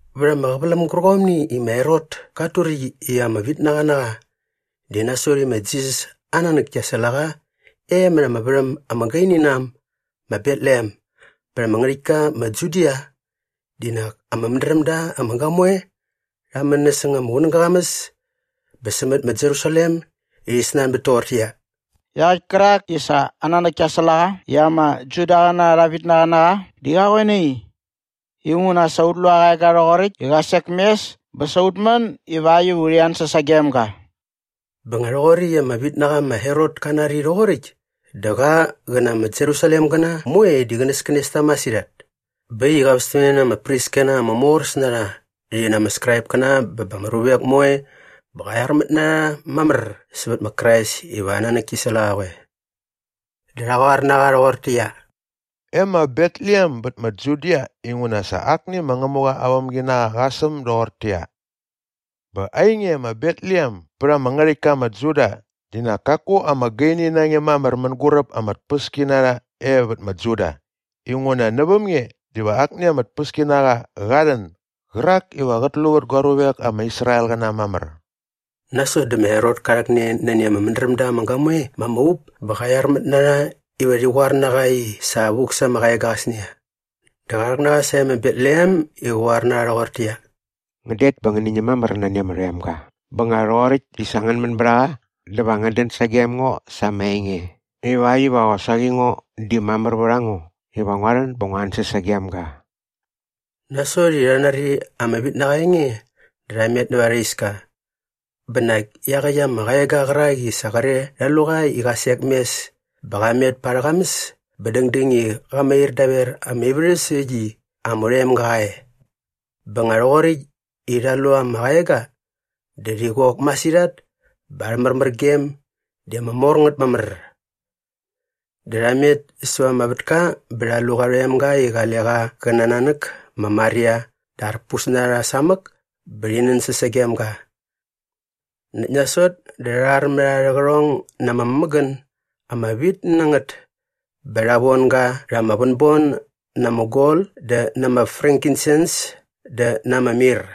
Vät ama qäväläm gärqomni i ma Herot kat turäkt i ama vitnaqa na qa di nasot i ma Jisas aa nanäk kia säl a qa e mät ama värhäm ama gaini na äm ma Betlehem bät ama ngärhäktka ma Judia di nak ama mädräm da ama gamoe rha män näsäng ama qunäga aa qamäs bä sämät ma Jerusalem i rhi snanbät toqortäqyia, “Iaqäkt kärak i sa aa nanäk kia säl a qa i ama Judaqäna arha vitnaqa na qa di qa qoe nai? Inguna sa ut lu aa qaega rhoqoräkt i qa sek mes bä sa ut män ivakt iva urhi ansäs sagem ga.” Bä nga rhoqoräkt i ama vitnaqa ma Herot ka nari rhoqoräkt dä qa qä na ama Jerusalemgäna moe di qänäskänes ta masirhat. Bä äkt i qa västämne na ama priskäna ama moräs na rha rhi na ama Skraipkäna bä ba ama ruvek moe bä qa qyarmät na rha mamär sävät ma Krais iva aa nanäk ki säl a qa qoe. Dä rha qoar na qa rhoqortäqyia, “E ma Betlehem bät ma Judia inguna sa akni ma Ngämuqa aa vämginaqa qa säm doqoräkt toqortäqyia, “‘Bä ainge ma Betlehem bät ama ngärhäktka ma Juda di nak kaku ama gaini na nge mamär mänguräp ama tpäskinarha e vät ma Juda inguna näväm nge diva akni ama tpäskinaqa qa rhän gärak iva qät lu vät gua ruvek ama Israelqäna mamär.’” Nasot dä ma Herot ka rhäkne nani ama mädräm da ama gamoe ma ama up bä qa qyarmät na rha iva rhi qoar na qa i sa vuk sa ama qaega qäsnia. Dä qa rhäk na rha sae ma Betlehem i qä qoar na rha rhoqortäqyia, “Ngän det bä ngäni ñäm mamär nani ama rhoemga bä nga rhoqoräkt i sa ngän män bät a qa dä va ngän dän sagem ngo sa ama enge ivakt iva qosaqi ngo di mamär vät a ngo iva ngua rhän bä ngu ansäs sagem ga.” Nasot i sa rha nari ama vitnaqa aa enge dä rha met näva arha iska. Bä nak iaqäkt ama qaega qärak i sa qre rha lu qa i qa sek mes bä qa met pa arhä qamäs bä dängdäng i qa mair daver ama ivärhäs äkt i ama rhoemga qa e. Bä nga rhoqoräkt i rha lu ama qaega dä rhi qok masirhat bä arhä märmärgem di ama mor ngät mamär. Dä rha met säva ama vätka bä rha lu qa rhoemga i qale qa qä na aa nanäk ma Maria dä arpus na rha samäk bä rhi nänsäs sagem ga. Näkt nasot dä rha rharmät arhä qärhong na ama mämägän ama vit na ngät bä rha von ga rha ama vänbon na ama gol dä na ama frankinsens dä na ama mir.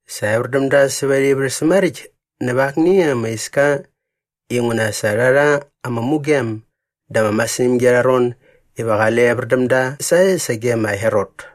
Sa evär däm da säva arhä ivärhäs maräkt näva akni ama iska inguna sa rha rha ama mugem da ama masirhämgi arha ron iva qale evär däm da sae sage ma Herot.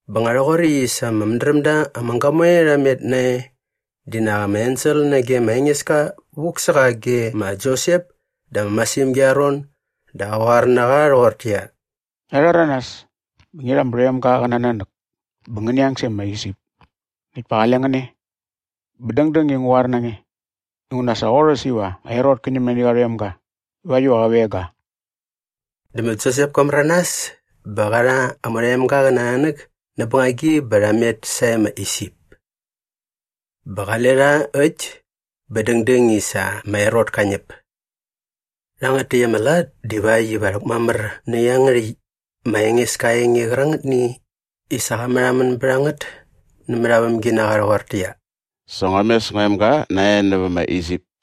Bä nga rhoqoräkt i sa ama mädräm da ama gamoe rha met nae di nak ama ensel nage ma Engeska vuk sä qa ge ma Josep da ama masirhämgi arha ron dä qa qoar na qa rhoqortäqyia, “Ngia rhäranas bä ngi rha ama rhoemga qä na aa nanäk bä ngäni ang sae ma Isip näkt pa qale ngän e bä dängdäng i ngu qoar na nge inguna sa qorhäs iva ma Herot kä ñäm nani qa rhoemga ivakt iva qä veng ga.” Dä ma Josep ka märanas bä qa rha ama rhoemga qä na aa nanäk näp bängagi bä rha met sae ma Isip. Bä qale rha äkt bä dängdäng i sa ma Herot ka ñäp. Rhangät täkt ama lat divakt iva rhäkmamär nä iangärhäkt ma Engeska aa enge qärangätni i sa qa märhamän bät a ngät nämät aa vämginaqa rhoqortäqyia, “Sa ngua mes ngua emga nae nävä ma Isip.”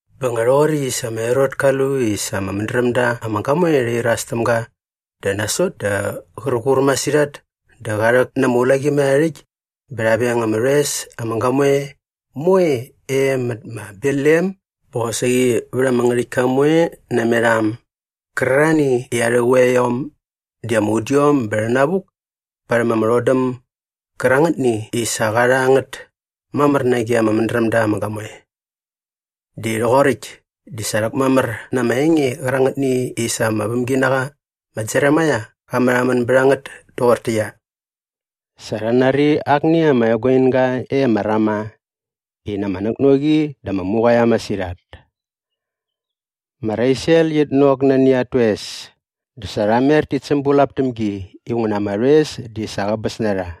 Bä nga rhoqoräkt i sa ma Herot ka lu i sa ama mädräm da ama gamoe rha iras täm ga dä nasot dä qär qur masirhat dä qa rhäk na ama ulaqimärharhärhäkt bä rha veng ama rhoes ama gamoe moe e mät ma Betlehem bä qosaqi vät ama ngärhäktka moe namet a äm gärarhani i arhä quiaiom di ama udiom bä rhänavuk parhäm ama rhodäm gärangätni i sa qa rha ngät mamär nage ama mädräm da ama gamoe. Di rhoqoräkt di sa rhäkmamär na ama enge qärangätni i sa ama vämginaqa ma Jeremaia qa märhamän bät a ngät toqortäqyia, “Sa rha nari akni ama eguinga e ma Rama i na ama näknoqi dä ama muqaia masirhat. Ma Rasiel qit nok nani at toes dä sa qia mer tit sämbulap täm gi inguna ama rhoes di sa qäbäs na rha.”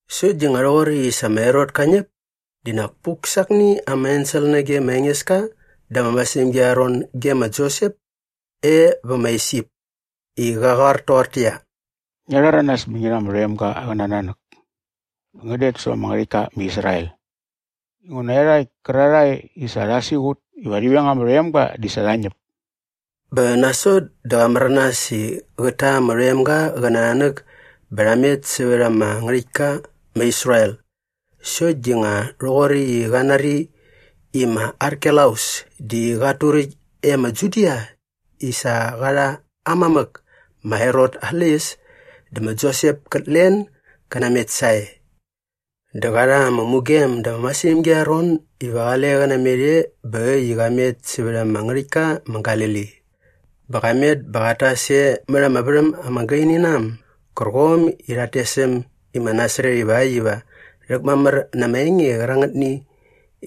Sokt di nga rhoqoräkt i sa ma Herot ka ñäp di nak puk sa akni ama ensel nage ma Engeska da ama masirhämgi arha ron ge ma Josep e vä ma Isip i qä qoar toqortäqyia, “Ngia rhäranas bä ngi rha ama rhoemga qä na aa nanäk bä ngän det sävät ama ngärhäktka ma Israel inguna iarhakt kärarhae i sa rha siqut iva rhi veng ama rhoemga di sa rha ñäp.” Bä nasot dä qa märanas i qät ta ama rhoemga qä na aa nanäk bä rha met sävät ama ngärhäktka ma Israel. Sokt di nga rhoqoräkt i qa nari i ma Arkelaus di qat turäkt e ma Judia i sa qa rha aa mamäk ma Herot aa släqyäs dä ma Josep kät len gä namet sae. Dä qa rha ama mugem da ama masirhämgi arha ron iva qale qä namet e bä äkt i qa met sävät ama ngärhäktka ma Galili. Bä qa met bä qat tas e mät ama värhäm ama gaini na äm gärqom i rhat tes äm i ma Nasaret ivakt iva rhäkmamär na ama enge qärangätni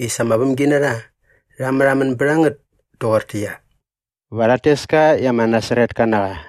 i sa ama vämginarha rha märhamän bät a ngät toqortäqyia, “Va rhat tes ka i ama Nasaretka na qa.”